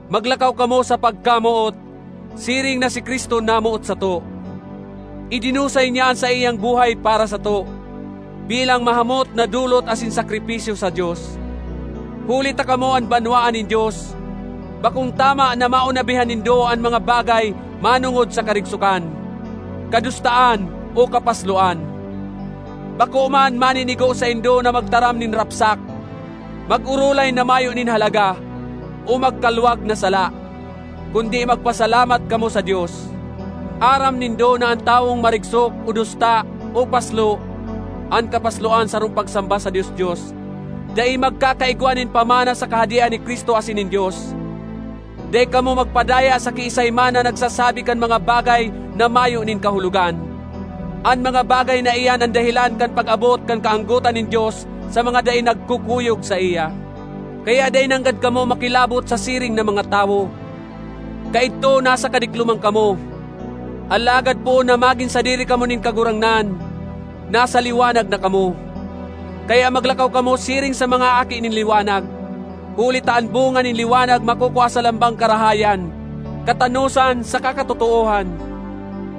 Maglakaw kamo sa pagkamoot, siring na si Cristo namoot sato. Idinusay niya an saiyang buhay para sato, bilang mahamot na dolot asin sakripisyo sa Dios. Huli ta kamo an banwaan nin Dios, bakong tama na maonabihan nindo an mga bagay manongod sa karigsokan, kadustaan o kapasloan. Bako man maninigo saindo na magtaram nin rapsak, mag-orolay na mayo nin halaga o magkalwag na sala; kundi magpasalamat kamo sa Dios. Aram nindo na an tawong marigsok o dusta o paslo (an kapasloan sarong pagsamba sa dios-dios) dai magkakaigwa nin pamana sa Kahadean ni Cristo asin nin Dios. Dai kamo magpadaya sa kiisay man na nagsasabi kan mga bagay na mayo nin kahulogan; an mga bagay na iyan an dahelan kan pag-abot kan kaanggotan nin Dios sa mga dai nagkukuyog saiya. Kaya dai nanggad kamo makilabot sa siring na mga tawo. Kaidto nasa kadikloman kamo, alagad poon na magin sadiri kamo nin Kagurangnan, nasa liwanag na kamo. Kaya maglakaw kamo siring sa mga aki nin liwanag, huli ta an bunga nin liwanag makukua sa lambang karahayan, katanosan, saka katotoohan.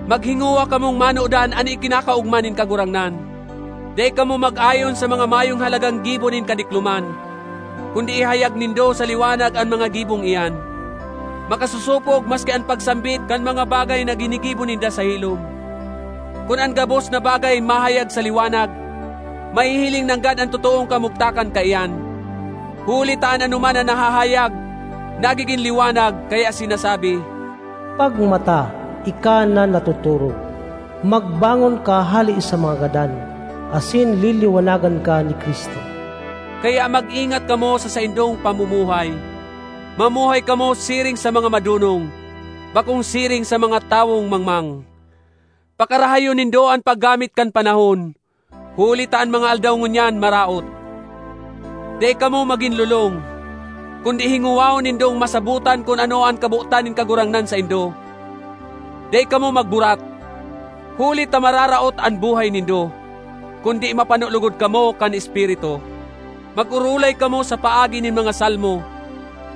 Maghingowa kamong manodan an ikinakaogma nin Kagurangnan. Dai kamo mag-ayon sa mga mayong halagang gibo nin kadikloman, kundi ihayag nindo sa liwanag an mga gibong iyan. (Makasosopog maski an pagsambit kan mga bagay na ginigibo ninda sa hilom.) Kun an gabos na bagay mahayag sa liwanag, mahihiling nanggad an totoong kamugtakan kaiyan; huli ta an anoman na nahahayag, nagigin liwanag, kaya sinasabi, “Pagmata, ika na natotorog, magbangon ka hale sa mga gadan, asin liliwanagan ka ni Cristo.” Kaya mag-ingat kamo sa saindong pamumuhay. Mamuhay kamo siring sa mga madonong, bakong siring sa mga tawong mangmang. Pakarahayon nindo an paggamit kan panahon, huli ta an mga aldaw ngunyan maraot. Dai kamo magin lolong, kundi hingowahon nindong masabotan kun ano an kabotan nin Kagurangnan saindo. Dai kamo magburat, huli ta mararaot an buhay nindo; kundi mapano logod kamo kan Espiritu. Mag-orolay kamo sa paagi nin mga salmo,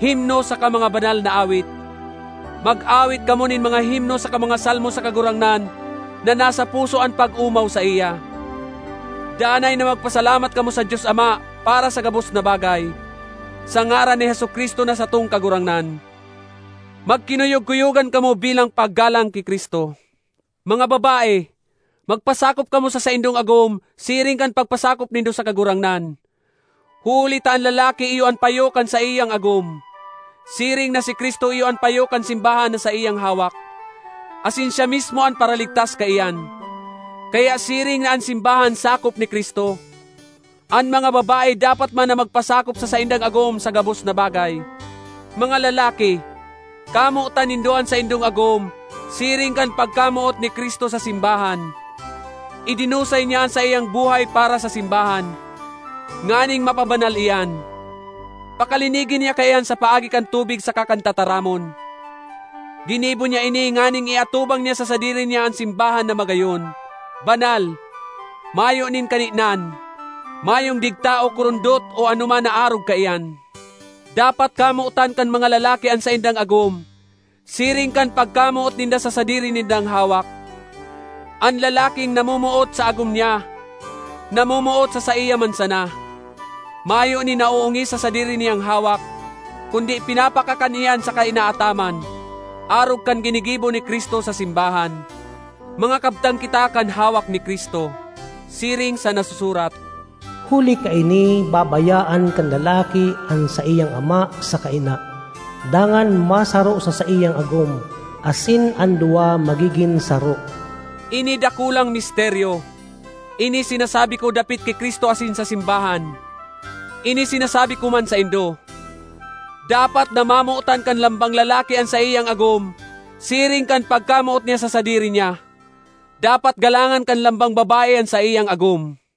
himno saka mga banal na awit; mag-awit kamo nin mga himno saka mga salmo sa Kagurangnan na nasa puso an pag-omaw saiya. Danay na magpasalamat kamo sa Dios Ama para sa gabos na bagay, sa ngaran ni Jesu-Cristo na satong Kagurangnan. Magkinuyog-kuyogan kamo bilang paggalang ki Cristo. Mga babae, magpasakop kamo sa saindong agom siring kan pagpasakop nindo sa Kagurangnan. Huli ta an lalaki iyo an payo kan saiyang agom, siring na si Cristo iyo an payo kan simbahan na saiyang hawak; asin siya mismo an Paraligtas kaiyan. Kaya siring na an simbahan sakop ni Cristo, an mga babae dapat man na magpasakop sa saindang agom sa gabos na bagay. Mga lalaki, kamotan nindo an saindong agom siring kan pagkamoot ni Cristo sa simbahan; idinusay niya an saiyang buhay para sa simbahan, nganing mapabanal iyan, pakalinigi niya kaiyan sa paagi kan tubig saka kan tataramon. Ginibo niya ini nganing iatubang niya sa sadiri niya an simbahan na magayon, banal, mayo nin kaninan, mayong digta o kurundot o anoman na arog kaiyan. Dapat kamotan kan mga lalaki an saindang agom siring kan pagkamoot ninda sa sadiri nindang hawak. An lalaking namomoot sa agom niya, namomoot sa saiya man sana. (Mayo nin naoongis sa sadiri niyang hawak, kundi pinapakakan iyan saka inaataman, arog kan ginigibo ni Cristo sa simbahan. Mga kabtang kita kan hawak ni Cristo.) Siring sa nasusurat, “Huli kaini babayaan kan lalaki an saiyang ama saka ina, dangan masaro sa saiyang agom, asin an duwa magigin saro.” Ini dakulang misteryo; ini sinasabi ko dapit ki Cristo asin sa simbahan. Ini sinasabi ko man saindo: dapat na mamotan kan lambang lalaki an saiyang agom siring kan pagkamoot niya sa sadiri niya; dapat galangan kan lambang babae an saiyang agom.